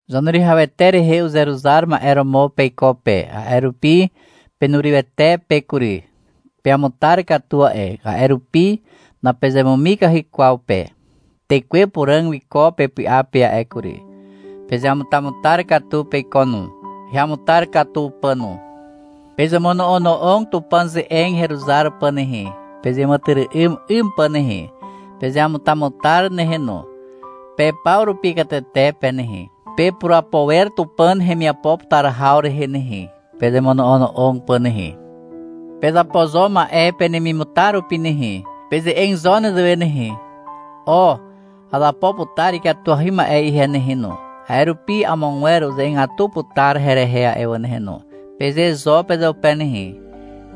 Zaneruwihawete rehe uzeruzar ma'e romo peiko pe, a'e rupi penurywete pe kury. Peamutar katu a'e, a'e rupi napezemumikahy kwaw pe. Tekwe Puràg wiko pepy'a pe a'e kury. Pezeamutamutar katu peiko no, heamutar katu pà no. Pezemono'ono'og Tupàn ze'eg heruzar pà nehe, pezeàmàtyry'ym 'ym pà nehe. Pezeamutamutar nehe no. Pe paw rupi katete pe nehe, pepurapo wer Tupàn hemiapo putar haw rehe nehe, pezemono'ono'og pà nehe. Pezapo zo ma'e penemimutar rupi nehe. Peze'eg zo nezewe nehe, — O, azapo putar ikatuahy ma'e ihe nehe no, a'e rupi amogwer uze'egatu putar herehe a'e wà nehe no, peze zo pezeupe nehe.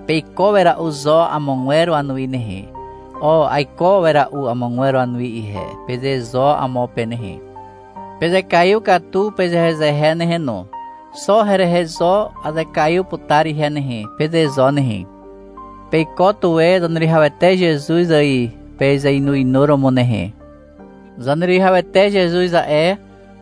Peiko wera'u zo amogwer wanuwi nehe. — O, aiko wera'u amogwer wanuwi ihe, peze zo amo pe nehe. Pezekaiw katu pezehezehe nehe no. — Xo herehe zo azekaiw putar ihe nehe, peze zo nehe. Peiko tuwe Zaneruwihawete Zezuz ài pezeinuinuromo nehe. Zaneruwihawete Zezuz a'e,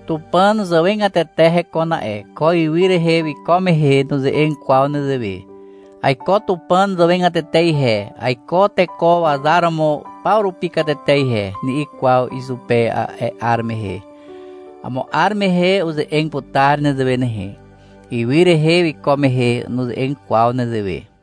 Tupàn zàwegatete hekon a'e. Ko ywy rehe wiko mehe nuze'eg kwaw nezewe. — Aiko Tupàn zàwegatete ihe, aiko teko wazar romo paw rupi katete ihe, ni'i kwaw izupe a'e 'ar mehe. (Amo 'ar mehe uze'eg putar nezewe nehe. Ywy rehe wiko mehe nuze'eg kwaw nezewe.)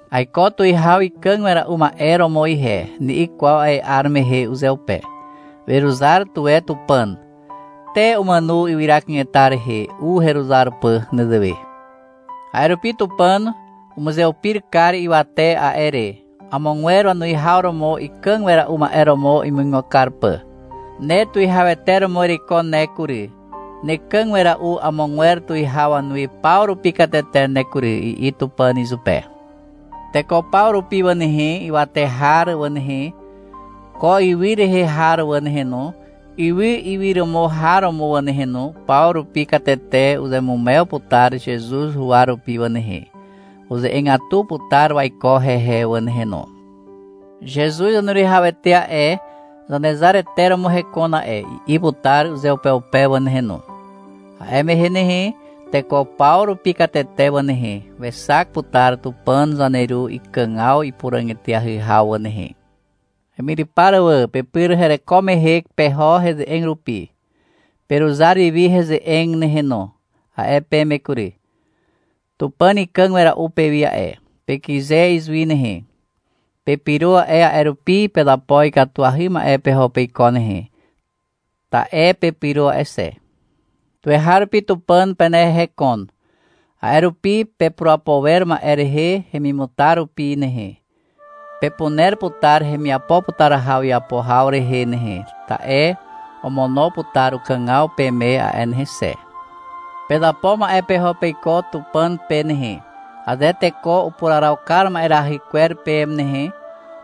— Aiko tuwihaw ikàg wera'u ma'e romo ihe, ni'i kwaw a'e 'ar mehe uzeupe. Weruzar tuwe Tupàn. Te umàno ywyra kanetar rehe u heruzar pà nezewe. A'e rupi Tupàn umuzeupir kar ywate a'e re, amogwer wanuwihaw romo ikàg wera'u ma'e romo imuigo kar pà. — Ne tuwihawete romo ereiko ne kury, nekàg wera'u amogwer tuwihaw wanuwi paw rupi katete ne kury, i'i Tupàn izupe. Teko paw rupi wà nehe, ywate har wà nehe, ko ywy rehe har wà nehe no, ywy iwyromo har wà nehe no, paw rupi katete uzeamumew putar Zezuz huwa rupi wà nehe. Uze'egatu putar waiko hehe wà nehe no. — Zezuz Zaneruwihawete a'e, Zanezarete romo hekon a'e, i'i putar uzeupeupe wà nehe no. A'e mehe nehe, teko paw rupi katete wà nehe, wexak putar Tupàn zaneru ikàgaw ipuràg eteahy haw wà nehe. Hemyrypar wà, pepyr hereko mehe peho heze'eg rupi. — Peruzar wiwi heze'eg nehe no, a'e peme kury. Tupàn ikàg wera'u pewi a'e. Pekyze izuwi nehe. Pepyro a'e, a'e rupi pezapo ikatuahy ma'e peho peiko nehe, ta'e pepyro a'e xe. Tuweharupi Tupàn penehe hekon. A'e rupi pepurapo wer ma'e rehe hemimutar rupi nehe. Pepuner putar hemiapo putar haw iapo haw rehe nehe, ta'e omono putar ukàgaw peme a'e nehe xe. Pezapo ma'e peho peiko Tupàn pe nehe. Aze teko upuraraw kar ma'erahy kwer peme nehe,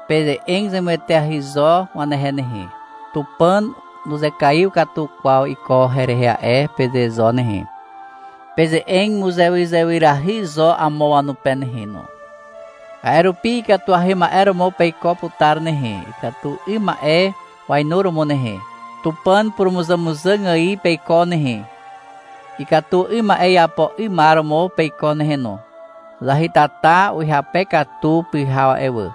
peze'eg zemueteahy zo wanehe nehe. — Tupàn nuzekaiw katu kwaw iko herehe a'e, peze zo nehe. Peze'eg muzewyzewyrahy zo amo wanupe nehe no. A'e rupi ikatuahy ma'e romo peiko putar nehe, ikatu 'ym ma'e wainuromo nehe. Tupàn purumuzàmuzàg ài peiko nehe, ikatu 'ym ma'e iapo 'ymar romo peiko nehe no. Zahytata uhyape katu pyhaw a'e wà.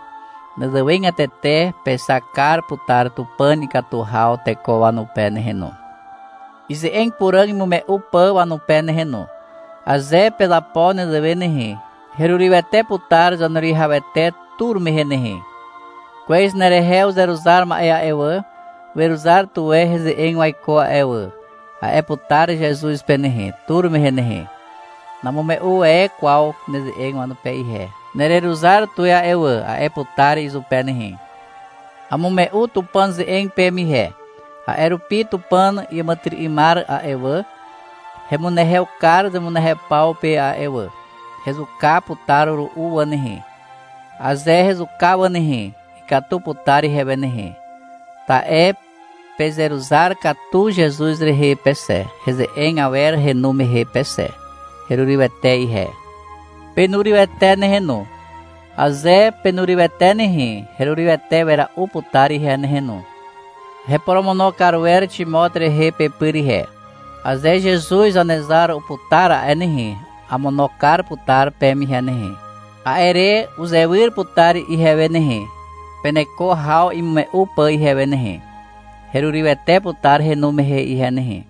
Nezewegatete pexak kar putar Tupàn ikatu haw teko wanupe nehe no, ize'eg puràg imume'u pà wanupe nehe no. Aze pezapo nezewe nehe, herurywete putar Zaneruwihawete tur mehe nehe. — Kwez nerehe uzeruzar ma'e a'e wà, weruzar tuwe heze'eg waiko a'e wà, a'e putar Zezuz pe nehe, tur mehe nehe. — Namume'u e kwaw neze'eg wanupe ihe, nereruzar tuwe a'e wà, a'e putar izupe nehe. Amume'u Tupàn ze'eg peme ihe, a'e rupi Tupàn iàmàtyry'ymar a'e wà, hemunehew kar zemunehew paw pe a'e wà. Hezuka putar ru'u wà nehe. Aze hezuka wà nehe, ikatu putar ihewe nehe, ta'e pezeruzar katu Zezuz rehe pe xe, heze'eg awer henu mehe pe xe. Herurywete ihe. Penurywete nehe no. Aze penurywete nehe, herurywete wera'u putar ihe nehe no. Heporomono kar wer Ximot rehe pepyr ihe. Aze Zezuz Zanezar uputar a'e nehe, amono kar putar peme ihe nehe. A'e re uzewyr putar ihewe nehe, peneko haw imume'u pà ihewe nehe. Herurywete putar henu mehe ihe nehe.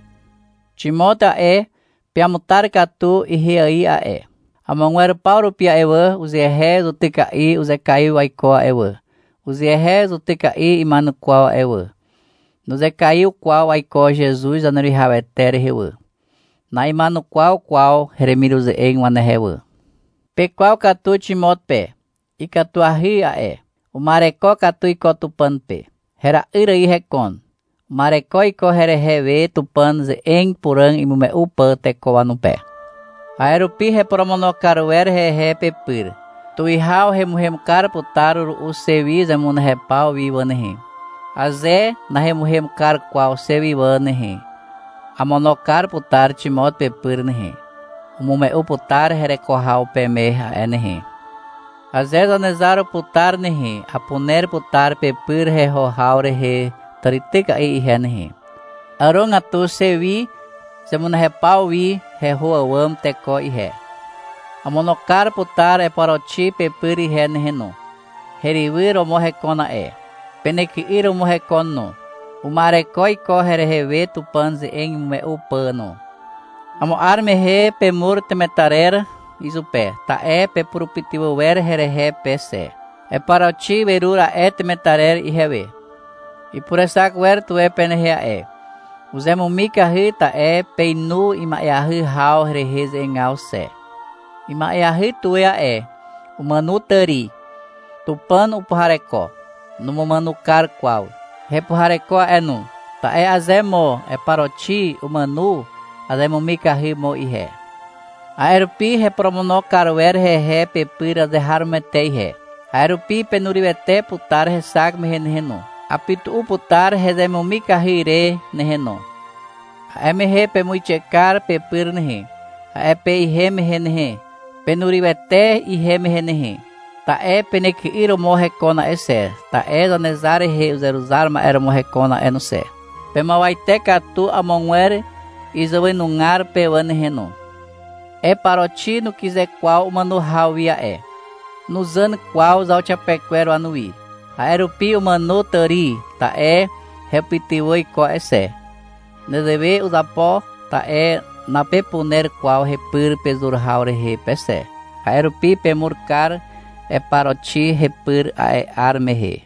Ximot a'e, peamutar katu ihe ài a'e. Amogwer paw rupi a'e wà, uzehe zutyka'i uzekaiw waiko a'e wà, uzehe zutyka'i ima'enukwaw a'e wà. Nuzekaiw kwaw waiko Zezuz Zaneruwihawete rehe wà. Na'ima'enukwaw kwaw hemiruze'eg wanehe wà. Pekwaw katu Ximot pe. Ikatuahy a'e. Uma'ereko katu iko Tupàn pe. Hera'yr ài hekon. Uma'ereko iko herehe we, Tupàn ze'eg puràg imume'u pà teko wanupe. A'e rupi heporomono kar wer hehe pepyr. Tuwihaw hemuhem kar putar ru'u xe wi zemunehew paw wi wà nehe. Aze nahemuhem kar kwaw xe wi wà nehe, amono kar putar Ximot pepyr nehe. Umume'u putar hereko haw peme a'e nehe. Aze Zanezar uputar nehe, apuner putar pepyr heho haw rehe tàrityka'i ihe nehe. Àrogatu xe wi zemunehew paw wi heho àwàm teko ihe. Amono kar putar Eparoxi pepyr ihe nehe no. Herywyr romo hekon a'e. Penyky'yr romo hekon no. Uma'ereko iko herehe we Tupàn ze'eg imume'u pà no. Amo 'ar mehe pemur temetarer izupe, ta'e pepurupytywà wer herehe pe xe. Eparoxi werur a'e temetarer ihewe. Ipurexak wer tuwe penehe a'e. Uzemumikahy, ta'e peinu ima'eahy haw rehe ze'egaw xe. Ima'eahy tuwe a'e. Umàno tàri. Tupàn upuhareko. Numumàno kar kwaw. Hepuhareko a'e no. Ta'e aze mo Eparoxi umàno, azemumikahy mo ihe. A'e rupi heporomono kar wer hehe pepyr azeharomoete ihe. A'e rupi penurywete putar hexak mehe nehe no. Apytu'u putar hezemumikahy re nehe no. A'e mehe pemuixe kar pepyr nehe, a'e pe ihem mehe nehe. Penurywete ihem mehe nehe. Ta'e penyky'yr romo hekon a'e xe, ta'e Zanezar rehe uzeruzar ma'e romo hekon a'e no xe. Pemuawate katu amogwer izàwenugar pe wà nehe no. Eparoxi nukyze kwaw umàno haw wi a'e. Nuzàn kwaw zauxiapekwer wanuwi. A'e rupi umàno tàri, ta'e hepytywà iko a'e xe. Nezewe uzapo, ta'e napepuner kwaw hepyr pezur haw rehe pe xe. A'e rupi pemur kar Eparoxi hepyr a'e 'ar mehe.